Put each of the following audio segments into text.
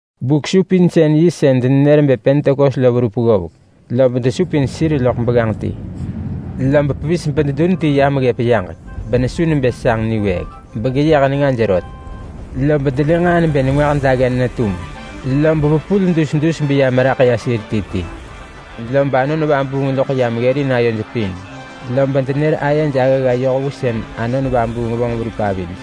Buk-supinsën-yi sën denenër bë Pentekos lo verup ggovek lob desupin sir loḳ begganġ ti. Lob pevis bededun ti yam ggëp yaġek, benesu nebë sanġ niwëëk, begeyeh nengaj rot. Lob delë nġaa nebë nengwah daggen netum, lob vepul dus dus beya meraḳ ya sir ti ti. Lob Anon Vabuung loḳ yam ggërin ayoj pin, lob denër ayej aggagga yoh vu Anon Vabuung vonġ verup avij.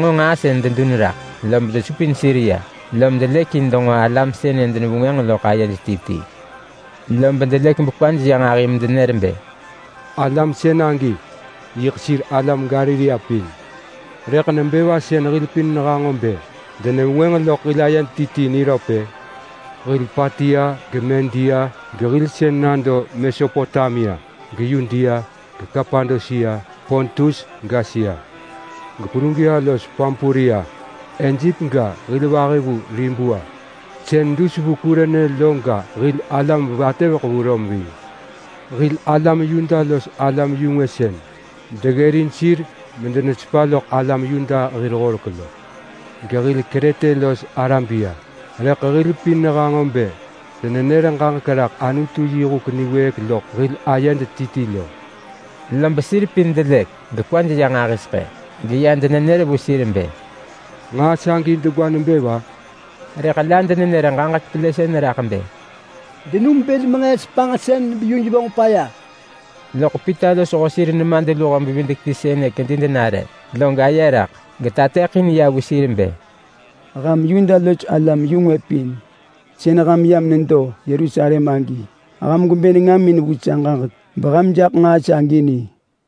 denġo nġaa sën dedun raḳ, lob desupin sir ya, lom delëk in denġo alam sënë denevengwënġ loḳ ayej ti ti. Lob delëk bekwaj ya nġahi medenër bë, “Alam sën agi yiḳ sir Galilea pin! Rëḳ nebë va sën hil pin nehanġo bë denevengwënġ loḳ hil ayed ti ti niröp-ë? Hil Patia geMedia, gehil sën nado Mesopotamia, geYudea, geKapadosia, Pontus, gAsia. GePrugia los Pampulia, Ejep ga, hil vahi vu Libua sën dus vu Kurene lo ga, hil alam vatëveḳ vu Rom ving. Hil alam Yuda los alam-yu-ngwë sën deggërin sir medenesepa loḳ alam Yuda hir horek lo, gehil Krete los Arabia. Rëḳ hil pin nehanġo bë denenër ġaġek raḳ Anutu yi huk niwëëk loḳ hil ayed ti ti. Lob sir pin delëk gekwaj ya nġahiseḳë. Geya denër vu sir nebë, “Nġaa sagi degwa nebë va?” Rëḳ la denenër ġaġek pelësën nebë, “Denum bël menġëës panġsën beyuj vonġ paya.” Loḳ Pita losho sir nemadluho-bevidek-ti sënë kedi denare, lob tahi niwëëk genër ranġah vu alam bë, “Ham Yuda los alam-yu-ngwë pin sën ham yam nedo Yerusalem agi! Ham gwebë nengamin vu sa ġaġek, beham jaḳ nġaa sagi ni!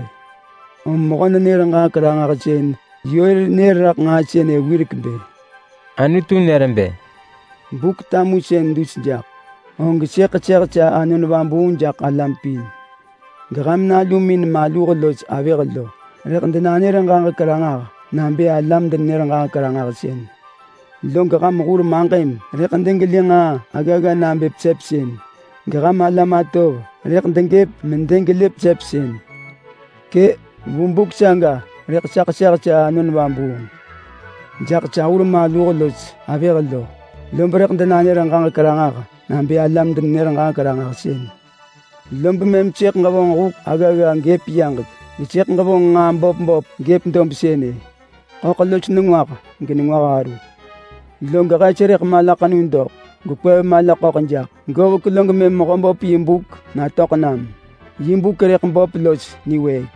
Rëḳ mu mehö-nenër-ġaġek-ranġahsën Yoel nër raḳ nġaa sënë wirek bë: ‘Anutu nër bë, “Buk-tamusën dus jaḳ, og sëḳ ḳeseh sa Anon Vabuung jaḳ alam pin. Geham nalumin maluh los avëh lo rëḳ denanër ġaġek ranġah nabë alam-denenër-ġaġek-ranġahsën. Log ham hur maġëm rëḳ degelë nġaa aggagga nabë pesepsën, geham alam atov rëḳ degëp medegelë pesepsën. Kë! Vu buk saga rëḳ sa ḳeseh sa Anon Vabuung jaḳ sa hur maluh los avëh, lob rëḳ denanër ġaġek ranġah nabë alam-denenër-ġaġek-ranġahsën. Lob mëm sëḳ ġevonġ huk aggagga gëp yaġek, gesëḳ ġevonġ nġaa böp böp gëp dob sënë: Ḳöḳ los nengwah genengwah aru. Log hes rëḳ malaḳenu doḳ, gekwev mala ḳöḳ jaḳ. Govek log mëm Mehöböp yi buk natöḳ nam. Yi buk rëḳ böp los niwëëk.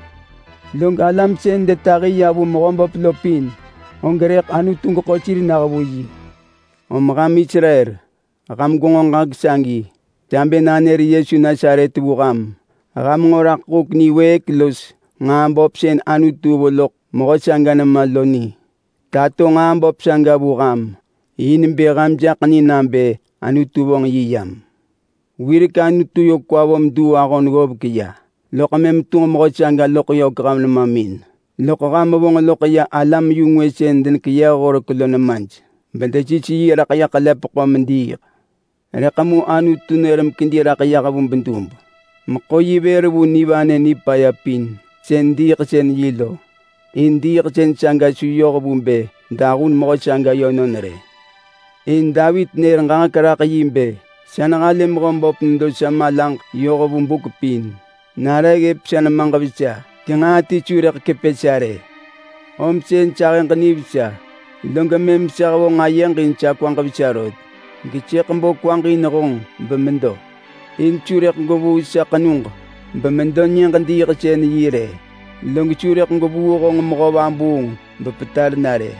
Log alam sën detahi ya vu Mehöböp lo pin, og rëḳ Anutu geḳo sir nah vu yi.” ’ Om ham Israel! Ham gwenġo ġaġek sagi! Sa bë nanër Yesu Nasaret vu ham: Ham nġo raḳ huk niwëëk los nġaa böp sën Anutu vo loḳ mehö saga nema lo ni. Tato nġaa böp saga vu ham in bë ham jaḳ ni nabë Anutu vonġ yi yam. Wirek Anutu yö kwa vo meduu ahon ggovek ya, log mëm tunġ mehö saga loḳ yök ham nemamin. Loḳ ham vonġ loḳ ya alam-yu-ngwë sën denekeyëh horek lo nemaj, bedesis yi raḳ ya ḳelepeḳo mediiḳ. Rëḳ mu Anutu nër mekedi raḳ yah vu bedub meḳo yi vër vu nivanë nipaya pin sën diiḳsën-yi lo. In diiḳsën saga su yoh vu bë dahun mehö saga yönon rë. In Davit nër ġaġek raḳ yi bë: ‘Sa nehalë Mehöböp nedo sa malaġ yoh vu buk pin. Nare ggëp sa nemaġ vesa genġaa ti su rëḳ kepë sa rë. Om sën sa ahëġ nivesa, log mëm sa hevonġ ayeġ in sa kwaġ vesa rot. Gesëḳ bo kwaġ in honġ bemedo, in su rëḳ gwevuu sa ḳenug bemedo Nyëġ-diiḳsën-yi rë. Log su rëḳ gwevuu honġ mehö vabuung bepetar na rë.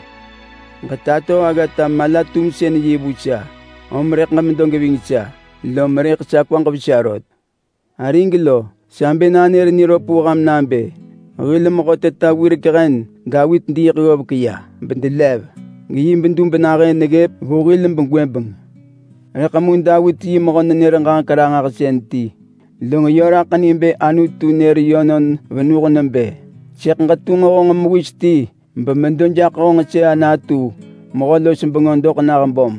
Ġetato aggata mala-tumsën-yi vu sa, om rëḳ ġemedo geving sa, lom rëḳ sa kwaġ vesa rot.’ Arig lo, sa bë nanër niröp vu ham nabë hil mehö teta wirek hen Davit diiḳ ggovek ya, bedelev. Geyi bedub nahën neggëp vu hil gwëbeng. Rëḳ mu Davit yi mehö-nenër-ġaġek-ranġahsën ti, log yö raḳ ni bë Anutu nër yönon venuh nebë, ‘Sëḳ ġetunġ honġ mewis ti bemedo jaḳ honġ sëa natu mehö-los-bengö doḳ nah böm.’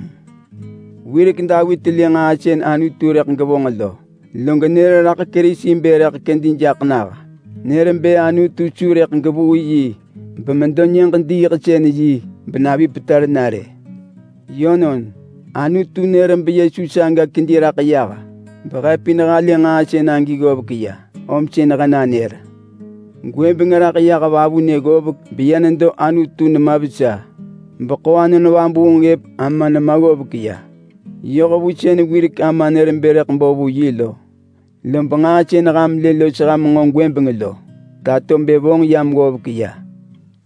Wirek Davit lë nġaa sën Anutu rëḳ gevonġ lo, log nër raḳ Kerisi bë rëḳ kedi jaḳ nah. Nër bë Anutu su rëḳ gevuu yi bemedo Nyëġ-diiḳsën-yi benavi petar na rë. Yönon, Anutu nër beYesu saga kedi raḳ yah, behe pin halë nġaa sën agi ggovek ya om sën he nanër. Gwëbeng raḳ yah vavunë ggovek beya nedo Anutu nema vesa, beḳo Anon Vabuung ggëp ama nema ggovek ya, yoh vu sën wirek Ama nër bë rëḳ bo vu yi lo. Lob nġaa sën ham lë los ham nġo gwëbeng lo tato bë vonġ yam ggovek.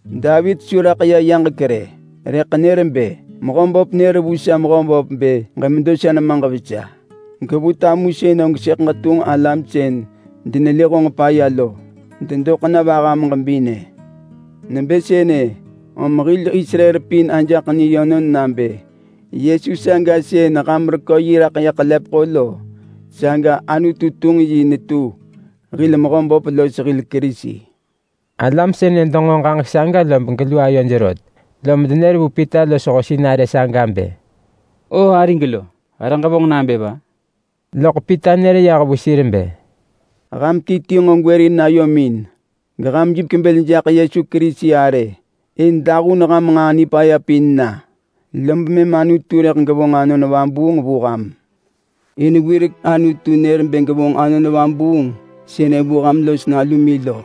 Davit su raḳ ya yaġek rë, rëḳ nër bë: ‘Mehöböp nër vu sa Mehöböp nebë, “Ġemedo sa nemaġ vesa. Gevu tamusën og sëḳ ġetunġ alam sën denelë honġ paya lo dedoḳ na vaham ġebinë.” ’ Nebë sënë om hil Israel pin ajaḳ ni yönon nabë Yesu saga sën ham rekö yi raḳ ya ḳelepeḳo lo, saga Anutu tunġ yi netu hil Mehöböp los hil Kerisi.” Alam sënë denġo ġaġek saga lob gelu ayoj rot, lom denër vu Pita losho sinarë saga nebë, “O arig lo! He rëḳ ġevonġ nabë va?” Loḳ Pita nër yah vu sir bë, “Ham ti ti nġo gwërin ayomin geham jipek bël jaḳ Yesu Kerisi arë in dahun ham nġaa nipaya pin na, lob mëm Anutu rëḳ gevonġ Anon Vabuung vu ham. In wirek Anutu nër bë gevonġ yi vu ham los nalumin,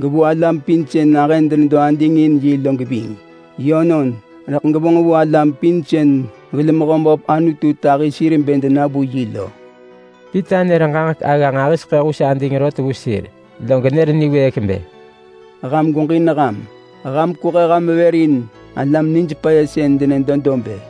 gevu alam pin sën nahën denedo ading in yi lo geving. Yönon! Rëḳ gevonġ vu alam pin sën hil Mehöböp Anutu tahi sir bë dena vu yi lo.” Pita nër ġaġek agga nġahiseḳë hus ading rot vu sir, log nër niwëëk bë, “Ham gweġin ham! Ham kwehe ham vër in alam nij paya sën denedo dob-ë!”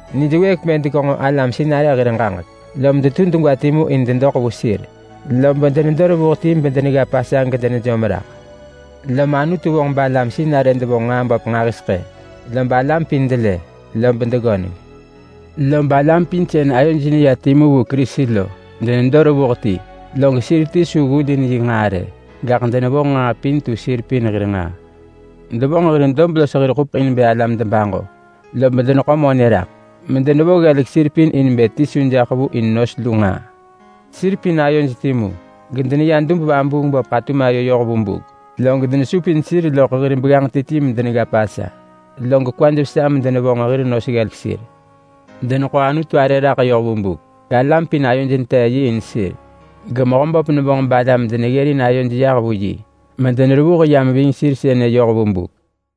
Nijwëëk bë degenġo alam sinarë hir ġaġek, lom detu degwa timu in dedoḳ vu sir, lob denedo revuh ti bedenegga Pasa gedenejom raḳ. Lom Anutu vonġ balam sinarë devonġ nġaa böp nġahiseḳë balam pin delë lob deggöneng. Lob alam pin sën ayoj neya timu vu Kerisi lo denedo revuh ti, log sir ti su ggulin yi nġaa rë, gaḳ denevonġ nġaa pin tu sir pin hir nġaa. Devonġ hir dob los hir ḳupeḳ in bë alam debaġo, lob deneḳo monë raḳ medenevo ggelek sir pin in bë ti su jaḳ vu in nos lu nġaa. Sir pin ayoj timu gedeneya dub-vabuung-böp ḳatum ayo yoh vu buk, log denesupin sir loḳ hir begganġ ti ti medenegga Pasa, log kwaj vesa medenevonġ hir nos ggelek sir. Deneḳo Anutu arë raḳ yoh vu buk, galam pin ayoj netee yi in sir. GeMehöböp nevonġ balam deneggërin ayoj yah vu yi mederevuh yam ving sir sënë yoh vu buk.